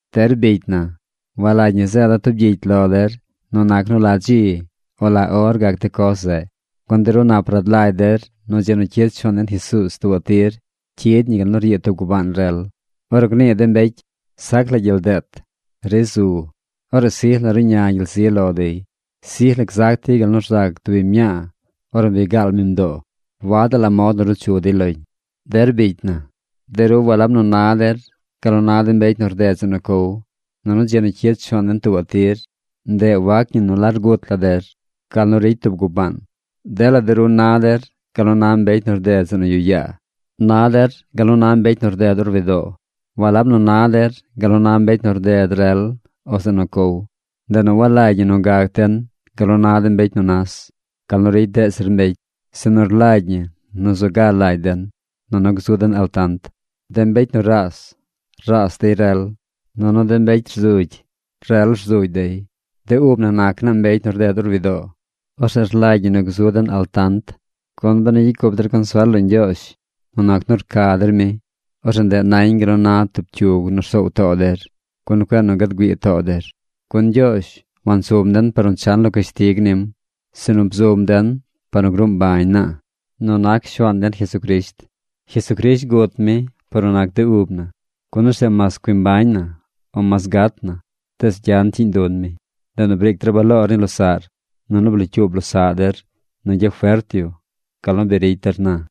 Der bicy na, walagy ñi zeeda̱ tub gyicy lo der nu nac nu la dzi o la or gac de coz zeꞌ, gun de ru nap rad lagy der nu dzi nu cyid Shuaan den Jesuuz tuubaꞌ tir cyid ñi gal nu ryiid tub gubaan rel. Ornu gnii de mbecy: “Sac la gyel deet. Ri zu”, orzeꞌ sij la ruꞌña gyel zi lo dey. Sij la gzac dey gal nu rzac tub biñ mñaa ornu bi gaal mi mdoo. Wadaꞌ la mod nu ruu chu dey loñ. Der bicy na, de ru walab nu na der gal nu na de mbecy nu rded zeꞌ nu cow, nunu dzi nu cyid Shuaan den tuubaꞌ tir, ndeꞌ wac ñi nu largut la der gal ricy tub gubaan. Dela de ru na der gal nu na mbecy nu rded zeꞌ nu yuꞌ yaa. Na der gal nu na mbecy nu rded orwidoo. Walab nu na der gal nu na mbecy nu rded rel o zeꞌ nu cow. Ndeꞌ nu walagy ñi nu gac den gal nu na de mbecy nu nas, gal nu ricy deꞌ zir mbecy, sinu rlagy ñi nu zu ga lagy den, nunu gzu den altant. De mbecy nu raas, raas dey rel. Nunu de mbecy rzugy, rel rzugy dey. De ub na nac naa mbecy nu rded or widoo. Orzeꞌ rlagy ñi nu gzu den altant. Gun benu gyicy cup der consuel lo Ñgyoozh nu nac nu rca der mi, orzeꞌ ndeꞌ nañ gal nu na tub cyug nu rsoow too der, gun cueꞌ nu gad güii too der. Gun Ñgyoozh wansum den par nu chan lo cashtig nim, sinu bzum den par nu gruu mbañ naa nu nac Shuaan den Jesucrisht. Jesucrisht gut mi par nu nac de ub na, gun orzeꞌ mas cui mbañ na, o mas gat na, tees gyan cyiiñ dun mi. Ndeꞌ nu briic der baloor ni losaꞌr, nunu blocyuub losaꞌ der nu gyafert yu gal nu bi ricy der na.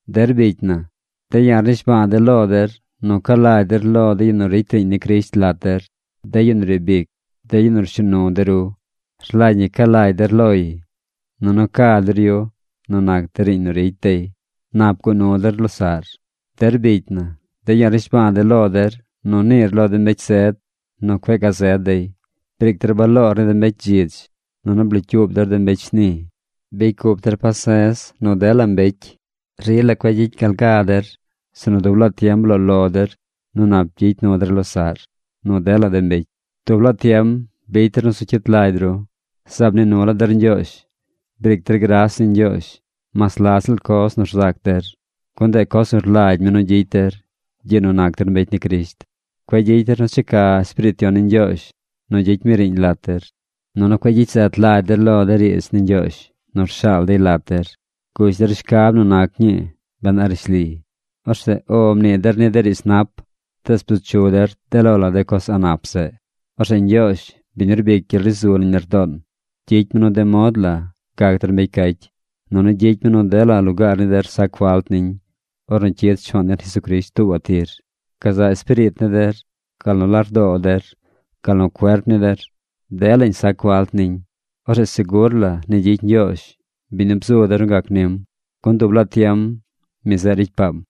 Der bicy na, de̱ ya̱ rnishba̱a̱ de̱ lo der nu ca lagy der lo de yu nu ricy riiñ ni Crisht lat der, de yu nu riib ic, de yu nu rshuu nu de ru. Rlagy ñi ca lagy der loy, nunu ca der yu nu nac de riiñ nu ricy dey. Nap guꞌ nu der losaꞌr. Der bicy na, de̱ ya̱ rnishba̱a̱ de̱ lo der nu niir lo de mbecy sed nu cueꞌ gazed dey. Briic der baloor ni de mbecy dzidz. Nunu blocyuub der de mbecy shni. Bicy cup der pase̱z nu dela mbecy. Rila cueꞌ gyicy gal ga der. Sinu dub laa tiem bloo lo der nu nap gyicy nu der losaꞌr, nu dela de mbecy. Dub laa tiem bicy der nu zu cyit lagy ru. Zaab mnii nu la der Ñgyoozh. Briic der gras ni Ñgyoozh mas la ziꞌl coz nu rzac der, gun ndeꞌ coz nu rlagy mi nu gyicy der gyiꞌ nu nac der mbecy ni Crisht. Cueꞌ gyicy der nu checa Espiriit Yon ni Ñgyoozh nu gyicy mi riiñ lat der. Nunu cueꞌ gyicy zet lagy der lo de riidz ni Ñgyoozh nu rshaal dey lat der. Gush der shcab nu nac ñii ben a rishli. Orzeꞌ “O” mnii der ni de riidz nap, tees bzu chu der de lo la de coz a̱ꞌ nap zeꞌ. Orzeꞌ Ñgyoozh, biñ nu rbic gyel ri zu nañ lardoon, gyicy mi nu de mod la gac der mbecy cacy, nunu gyicy mi nu dela lugaar ni der sac falt niñ ornu cyid Shuaan den Jesucrisht tuubaꞌ tir: gazaꞌ espiriit ni der, gal nu lardoo der, gal nu cuerp ni der. Delañ sac falt niñ. Orzeꞌ segur la ni gyicy Ñgyoozh, biñ nu bzu der nu gac nim, gun dub laa tiem mi zeꞌ ricy paam.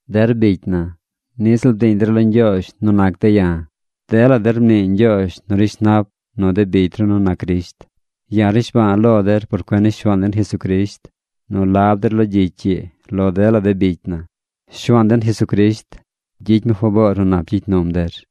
Der bicy na, niꞌ ziꞌl bdiiñ der lo Ñgyoozh nu nac de̱ ya̱. Dela der mnii ñgyoozh nu rishnap nu de bicy ru nu nac Crisht. Ya̱ rnishba̱a̱ lo der por cuen ni Shuaan den Jesucrisht nu lab der lo gyicy ii lo dela de bicy na. Shuaan den Jesucrisht gyicy mi faboor nu nap gyicy num der.